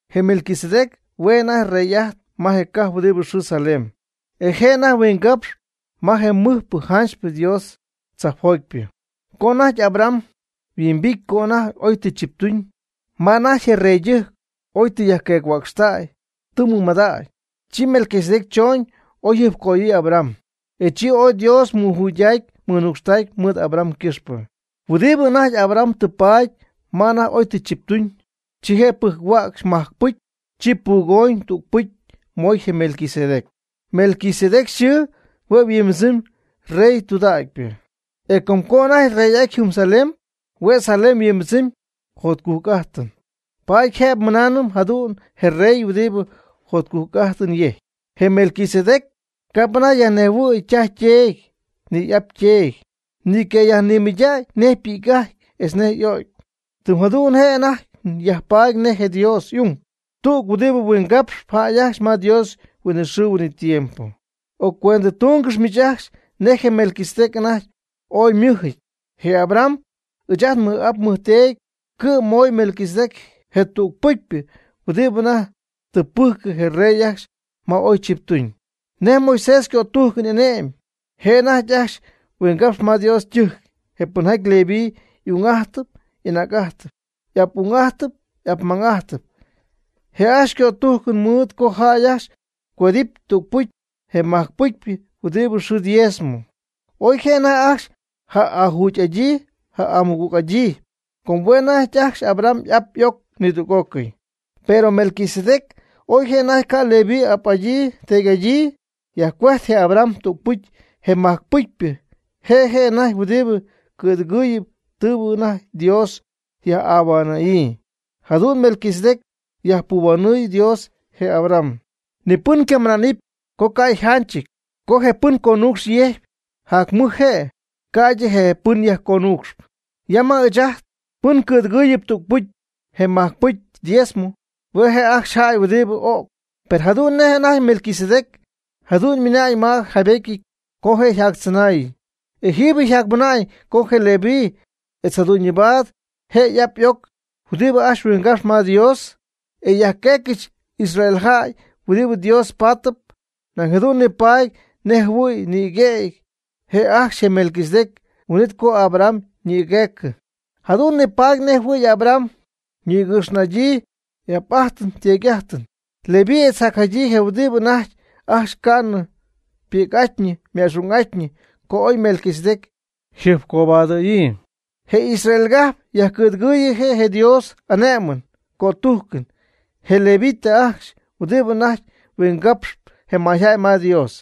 Je Melquisedec hue' je' anajty rey'ajtp ma je cajp huɨdi yxɨɨ Salem, e je' anajty huingapxp ma je mɨjpɨ janchypɨ Dios tzajpjotypɨ. Co anajty Abraham yhuimbity co anajty oy tɨ chiptuñ, ma anajty je reydɨjc oy tɨ yajqueec-huäcxtäy tɨ mɨmadactäy, chi Melquisedec chooñ oy jɨjpcoyöyɨ̈y Abraham, e chi ooy Dios mɨjuydacy mɨnucxtacy mɨɨd Abraham ycɨxpɨ. Huɨdibɨ anajty Abraham tɨ paady ma anajty oy tɨ chiptuñ, chi je' pɨjc-huäcxy majcpɨcy, chi pugooñ tüg-pɨcy mooy je Melquisedec. Melquisedec yxɨɨ hue' yhuimbɨdzɨmy “rey tudägypɨ”. E com co anajty yrey'aty jɨm Salem, hue' Salem yhuimbɨdzɨmy “jotcujc'ajtɨn”, paady jëbɨ nmɨnaanɨm jadu'n, “je rey huɨdibɨ jotcujc'ajtɨn yejcp”. Je Melquisedec ca'p anajty yajnejhuɨ̈y ytaj yteedy, ni y'ap yteedy. Ni ycayajnimɨydägy nej ypi'c'ajty etz nej y'ögy. Tɨm jadu'n je' anajty yajpaady nej je Dios y'ung, tüg huɨdibɨ huingapxp jäy ajcxy ma Dios huinɨxɨɨ huinɨtiempo. Occuendɨtungɨxy miich ajcxy nej je Melquisedec anajty ooy ymɨjɨty. Je Abraham, ɨɨch ajt nmɨj'ap nmɨjteedy cɨ'm mooy Melquisedec je tüg pɨcypɨ huɨdibɨ anajty tɨ pɨjcɨ je rey ajcxy ma oy chiptuñ. Nej Moisés ycötujcɨn y'ane'my je' anajty ajcxy yhuingapxy ma Dios ytɨjc je pɨnjaty Leví y'ung'ajtpy y'anäc'ajtpy, y'ap'ung'ajtpy y'apmang'ajtpy. Je' ajcxy cötujc mɨɨd co jäy ajcxy yajcuend'adɨpy tügpɨcy je majc-pɨcypɨ huɨdibɨ xɨɨ diezmo. Oy je' anajty ajcxy ja'ajugy'adyii ja'amɨgüg'adyii, com hue' anajty ajcxy Abraham y'ap y'oc nidüg'ócɨy. Per Melquisedec oy je' anajty ca' Leví ap'adyii teedy'adyii, yajcuejt je Abraham tügpɨcy je majc-pɨcypɨ. Je' je' anajty huɨdibɨ cɨ̈dɨgɨɨyɨ tɨɨbɨ anajty Dios yaj'ahuanɨ̈yii. Jadu'n Melquisedec yajpuhuanɨɨy Dios je Abraham. Ni pɨn ycamɨna'nɨp co ca' yjanchɨty co je pɨn conuucxɨn yejcp, jac mɨj je', ca'ydɨ je pɨn yajconuucxp. Ya ma ɨɨch ajt, pɨn cɨ̈dɨgɨɨyɨp tügpɨcy je majcpɨcypɨ (diezmo), hue' je' ajcxy jäy huɨdibɨ öcp. Per jadu'n nej anajty Melquisedec, jadu'n ymɨna'ñ ma yjaybetyɨty co je' yjactzɨnaayñɨ. E jëbɨ yajmɨna'ñ co je Leví etz jadu'ñyɨbaad je y'ap y'oc huɨdibɨ ajcxy huingapxp ma Dios, e yajcuejtcɨxy Israel jäy huɨdibɨ Dios patɨp, nañ jadu'n nipaady nej jɨhuɨ̈y ymɨgüety je' ajcxy je Melquisedec huin'it co Abraham ymɨgüejtɨ. Jadu'n nipaady nej jɨhuɨ̈y Abraham ñïgɨx'ajtyñɨ y'ap'ajtɨn yteedy'ajtɨn Leví etz jacjadyii je huɨdibɨ anajty ajcxy ca'nɨ ypi'c'atyñɨ yma'xung'atyñɨ co oy Melquisedec yjɨjpcobadɨ̈yii. Je Israel cajp yajcɨ̈dɨgɨɨyɨ je' je Dios y'ane'mɨn ycötujcɨn je Levita ajcxy huɨdibɨ anajty huingapxp je mayjäy ma Dios,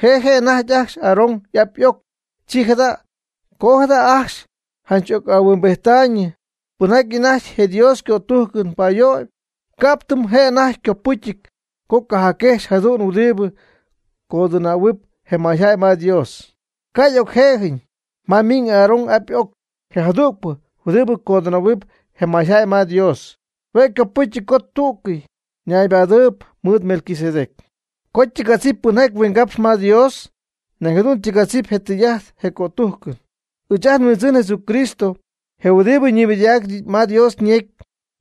je' je' anajty ajcxy Aarón y'ap y'oc. Chi jada' co jada ajcxy janch ca'ocyaj'ahuimbijttäy tudägy pɨnjaty anajty je Dios ycötujcɨn payöyb, ca'p tɨm je' anajty ycopɨcyɨty co ycajacquëxɨ̈gy jadüg huɨdibɨ codɨnähuɨp je mayjäy ma Dios, ca' y'ocje'jɨñ ma ymiiñ Aarón y'ap y'oc. Je jadügpɨ huɨdibɨ codɨnähuamyb je mayjäy ma Dios, hue' copɨcy co tú'cɨy naybadɨɨyb mɨɨd Melquisedec. Co ytɨgadzɨpy pɨnjaty huingapxp ma Dios, nañ jadu'n ytɨgadzip je tɨy'ajt je cötujcɨn. Ɨɨch ajt nHuindzɨn Jesucristo, je huɨdibɨ ñimɨydacpy ma Dios ñecy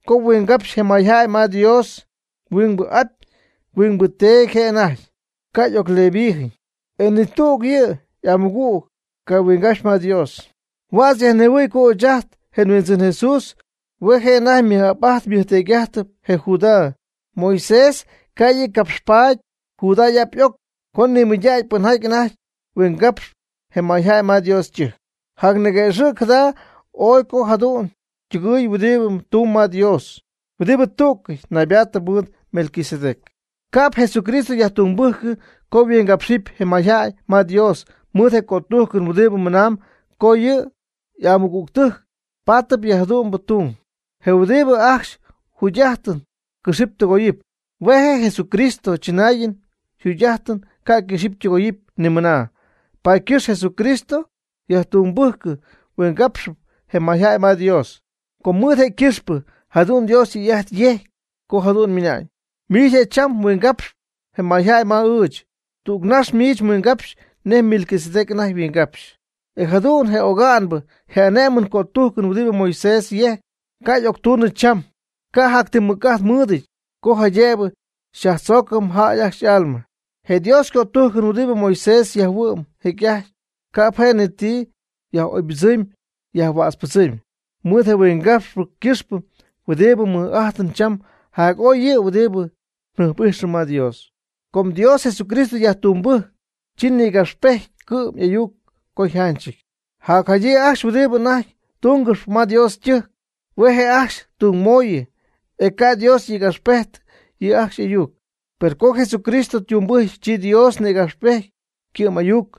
co huingapxa'ñ je mayjäy ma Dios, huingbɨ ap huingbɨ Teedy je' anajty, ca' y'ocLevíjɨn. E ni tüg yɨ' y'amɨgüg ca' yhuingapxy ma Dios. Huädz yajnejhuɨ̈y co ɨɨch ajt je nHuindzɨn Jesús hue' je' anajty ymɨj'ap'ajty ymɨjteedy'ajty je Judá. Moisés ca' yɨ' capxpaty Judá y'ap y'oc co nimɨydacy pɨnjaty anajty huingapxp je mayjäy ma Dios ytɨjc. Jacniguëxɨ̈cp jada ooy co jadüg ytɨgɨɨy huɨdibɨ tumb ma Dios, huɨdibɨ tú'cɨy naybaatɨp mɨɨd Melquisedec. Ca'p Jesucristo yajtungbɨjcɨ co huingapxɨp je mayjäy ma Dios mɨɨd je cötujcɨn huɨdibɨ mɨnaamb co yɨ' y'amɨgügtɨjc pátɨp yɨ jadu'mbɨ tung, je huɨdibɨ ajcxy yjugy'ajtɨn cɨxɨp tɨgoyɨp. Hue' je Jesucristo chɨnaayɨn yjugy'ajtɨn ca' ycɨxɨpy ytɨgoyɨpy ni mɨna, paady ycɨxp Jesucristo yajtungbɨjcɨ huingapxɨp je mayjäy ma Dios. Com mɨɨd je' ycɨxpɨ jadu'n Dios tɨy'ajt yejcy co jadu'n ymɨna'ñ: Miich je' cham mhuingapxyp je mayjäy ma ɨɨch. Tüg nax miich mhuingapxɨn nej Melquisedec anajty yhuingapxy. E jadu'n je oga'nbɨ je ane'mɨn cötujcɨn huɨdibɨ Moisés yejc, ca' y'octunɨ cham, ca' jac ti mɨc'ajt mɨɨdɨty co jaydëbɨ yajtzögɨpy jäy ajcxy y'alma. Je Dios ycötujcɨn huɨdibɨ Moisés jayhuɨ'm jecy'ajty, ca'p je' ni ti yaj'oybɨdzɨmy yajhuätzpɨdzɨmy. Mɨɨd je huingapxpɨ ycɨxpɨ huɨdibɨ nmɨɨd'ajtɨm cham jac'oy yɨ' huɨdibɨ njɨjp'ijxɨm ma Dios. Co Dios Jesucristo yajtungbɨcy, chi nïgapxpejty ycɨ'm ayuc co yjanchɨty. Jacjadyii ajcxy huɨdibɨ anajty tungɨxp ma Dios ytɨjc, hue' je' ajcxy tungmooyɨ, e ca' Dios nïgapxpejty yɨ' ajcxy y'ayuc. Per co Jesucristo ytungbɨjcy, chi Dios nïgapxpejty ycɨ'm'ayuc.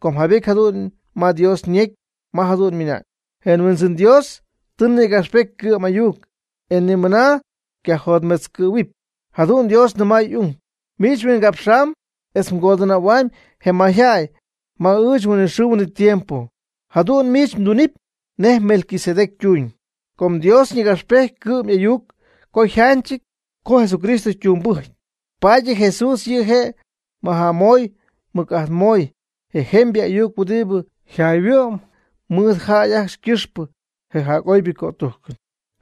Com jaybety jadu'n ma Dios ñecy ma jadu'n ymɨna'ñ: Je Huindzɨn Dios tɨ nïgapxpety ycɨ'm'ayuc, e ni mɨna ycajotmetzcɨ̈huɨpy. Jadu'n Dios nɨmay y'ung: Miich mhuingapxamyb etz mgodɨnähuamyb je mayjäy ma ɨɨch huinɨxɨɨ huinɨtiempo. Jadu'n miich mdunɨpy nej Melquisedec ytuuñ. Com Dios ñïgapxpejty ycɨ'm'ayuc co yjanchɨty co Jesucristo ytungbɨjcy, paady yɨ Jesús yɨ' je' majamoy mɨc'ajtmoy je jemybɨ ayuc huɨdibɨ yajhuɨ'm mɨɨd jäy ajcxy ycɨxpɨ, je jac'oybɨ cötujcɨn.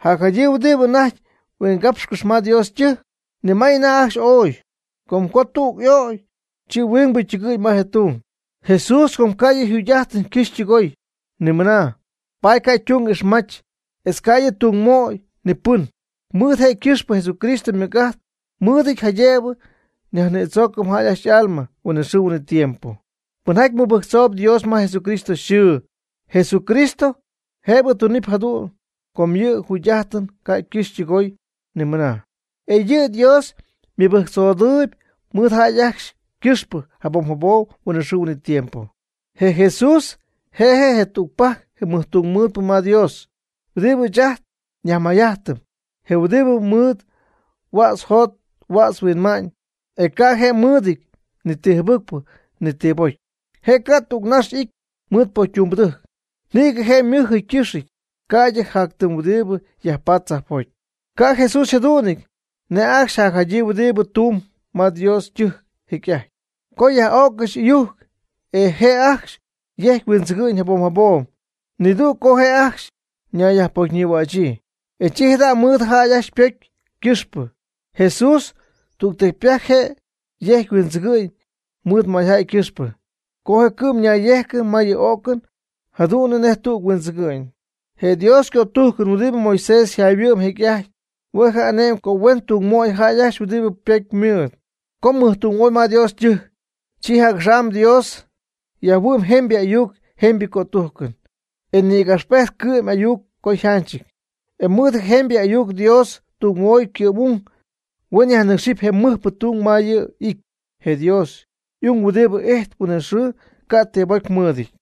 Jacjadyii huɨdibɨ anajty yhuingapxcɨxy ma Dios ytɨjc, nimay anajty ajcxy ooy. Com co tüg y'o'cy, chi huingbɨ ytɨgɨ̈y ma je' ytung. Jesús com ca' yɨ' yjugy'ajtɨn ycɨxɨpy ytɨgoyɨpy ni mɨna, paady ca' ytung ixmach, etz ca' yɨ'ytungmöy ni pɨn. Mɨɨd je' ycɨxpɨ Jesucristo mɨc'ajt mɨɨdɨty jaydëbɨ yajnïdzoocɨpy jäy ajcxy y'alma huinɨxɨɨ huinɨtiempo, pɨnjaty mɨbɨjctzooyb Dios ma Jesucristo yxɨɨ. Jesucristo jëbɨ tunɨpy jadu'n, com yɨ' yjugy'ajtɨn ca' ycɨxɨpy ytɨgoyɨpy ni mɨna. E yɨ' Dios mɨbɨjctzodɨɨb mɨɨd jäy ajcxy ycɨxpɨ jabom jabom huinɨxɨɨ huinɨtiempo. Je Jesús je' je' tügpajc je mɨjtungmɨɨdpɨ ma Dios, huɨdibɨ ɨɨch ajt nyajmayjajtɨm, je huɨdibɨ mɨɨd huädz yjot huädz yhuinma'ñ, e ca' je' mɨɨdɨty ni ti jɨbɨcpɨ ni ti pocy. Je' ca' tügnax y'ity mɨɨd pocytumbɨdɨjc. Nïgɨ je' ymɨjɨty ycɨxɨty, ca'ydɨ jac ti huɨdibɨ yajpat tzajpjoty. Ca' Jesús yjadu'nɨty nej ajcxy jacjadyii huɨdibɨ tuun ma Dios ytɨjc jecy'ajty, co yaj'öccɨxy ɨyujc, e je' ajcxy yejcpy huindzɨgɨ'ñ jabom jabom, mɨdüg co je' ajcxy ñayyajpocyñïhuächyii, e chi jada' mɨɨd jäy ajcxy ypocy ycɨxpɨ. Jesús tügtecypajc je' yejc huindzɨgɨ'ñ mɨɨd mayjäy ycɨxpɨ, co je' cɨ'm ñayyejcɨ ma yɨ o'cɨn jadu'n nej tüg huindzɨgɨ'ñ. Je Dios ycötujcɨn huɨdibɨ Moisés yjayhuɨ'm jecy'ajty, hue' y'ane'my co huen tungmöy jäy ajcxy huɨdibɨ pocy mɨɨd, co mɨjtungmoy ma Dios ytɨjc. Chi jac'axam Dios yajhuɨ'my jemybɨ ayuc jemybɨ cötujcɨn, e nïgapxpejty ycɨ'm'ayuc co yjanchɨty. E mɨɨd je jemybɨ ayuc Dios tungmoy ycɨ'm'ung, huen yajnɨcxɨp je mɨjpɨ tung ma yɨ' y'it, je Dios y'ung huɨdibɨ ijtp huinɨxɨɨ ca' ti bocy mɨɨdɨty.